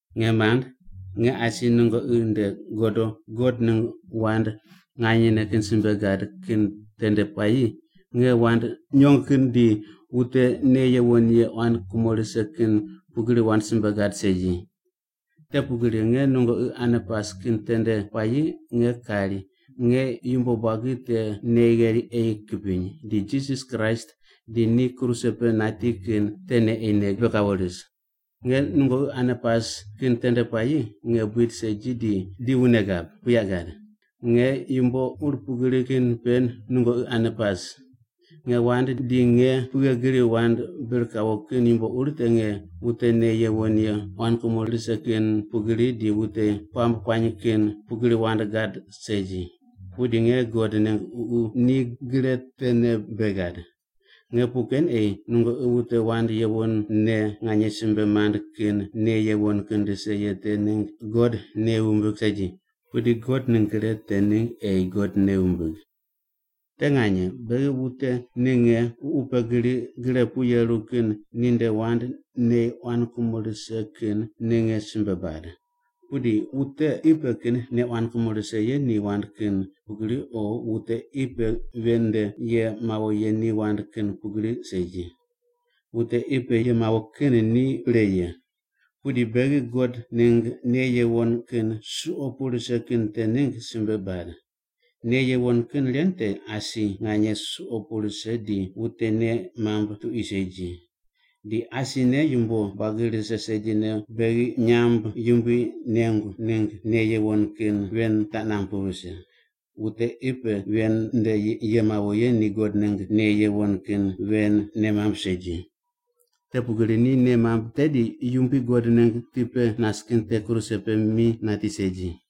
Nge mand, nge asi nungoqi nde godo God ningg wand nganyene kin simbe gad kin tende puayi nge wand nyong kin di wute nei yuwon ye quan kumo rise kin pugri wand simbe gad segi. Te pugri nge nungoqi ane pas kin tende puayi nge kari nge yumbo buagi te nei gheri ei kipiny, di Jisas Kraist di ni kruse pe nati kin tene ei nei pe kawo ris. Nge nungoqi ane pas kin tende puayi nge buid segi di wune gab, buyaq gad. Nge yumbo ur pugri kin pe nungoqi ane pas. Nge wand di nge pughe gri wand bir kawo kin yumbo ur te nge wute nei yuwon ye quan kumo rise kin pugri di wute puamb kuany kin pugri wand gad segi. Pudi nge God ningg Ququ ni gre tene bei gad. Nge puq ken ei nungoqi wute wand yuwonne nganye simbe mand kin nei yuwon kin rise ye te ningg God nei wumbig segi, pudi God ningg gre te ningg ei God nei wumbig. Te nganye beghi wute ninge ququ pe gri gre pu yeru kin ninde wand nei quan kumo rise kin ninge simbe bad, pudi wute qi pe kin nei quan kumo rise ye ni wand kin pugri o wute qi pe ven nde ye mawo ye ni wand kin pugri segi. Wute qi pe ye mawo kin ni pre ye. Pudi beghi God ningg nei yuwon kin suqo pu rise kin te ningg simbe bad. Nei yuwon kin ren te asi nganye suqo pu rise di wute nei mamb tuqui segi. Di asine yumbo buagi rise segine beghi nyamb yumbui nengu ningg nei yuwon kin ven taq namb pu vise. Wute qi pe ven nde ye mawo ye ni God ningg nei yuwon kin ven nei mamb segi. Te pugri ni nei mamb, tedi Yumbui God ningg ti pe nas kin te kruse pe mi nati segi.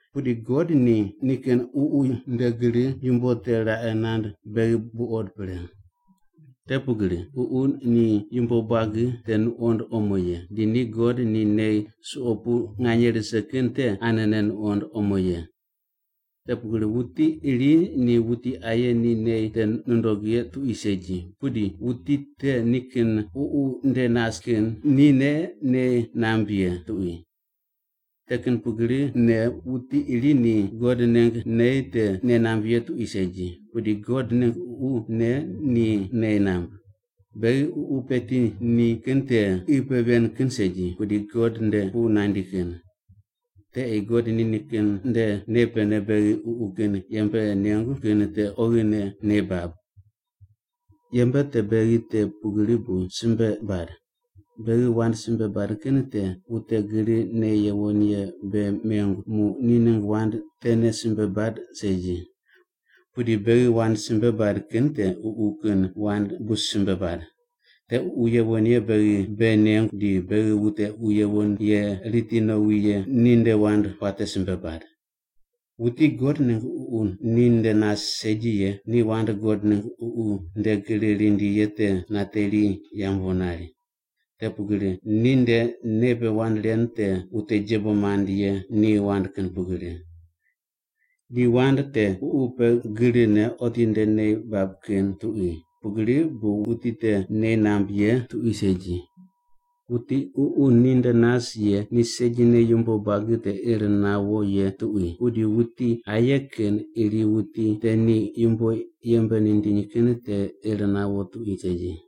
Pudi God ni nikin Ququ nde gri yumbo te raqe nand beghi buqod pre. Te pugri Ququ ni yumbo buagi te nuqond omo ye, di ni God ni nei suqo pu nganye rise kin te anene nuqond omo ye. Te pugri wuti iri ni wuti aye ni nei te nundog ye tuqui segi, pudi wuti te nikin ququ ninde nas kin nine nei namb ye tuqui. Te kin pugrine wuti iri ni God ningg nei te nei namb ye tuqui segi, pudi God ningg Ququ ne ni nei namb. Beghi Ququ peti ni kin te qi pe ven kin segi, pudi God nde pu nandi kin. Te ei God nikin nde nei pene beghi ququ kin yembe nengu kin te oghine nei bab. Yembe te beghi te pugri bu simbe bad. Beghi wand simbe bad kin te wute gri nei yuwon ye bei mengu muq ni ningg wand tene simbe bad segi. Pudi beghi wand simbe bad kin te Ququ kin wand bu simbe bad. Te Ququ Yuwon Ye beghi bei nengu di beghi wute Ququ Yuwon Ye riti nowi ye ninde wand puate simbe bad. Wuti God ningg Ququ ninde nas segi ye ni wand God ningg Ququ nde gri rindi ye te nateri yambu nari. Te pugri ninde nei pe wand ren te wute jebo mand ye ni wand kin pugri. Di wand te Ququ pe grine otinde nei bab kin tuqui, pugri bu wuti te nei namb ye tuqui segi. Wuti Ququ ninde nas ye ni segine yumbo buagi te ir nawo ye tuqui, pudi wuti aye kin iri wuti te ni yumbo yembe nindiny kin te ir nawo tuqui segi.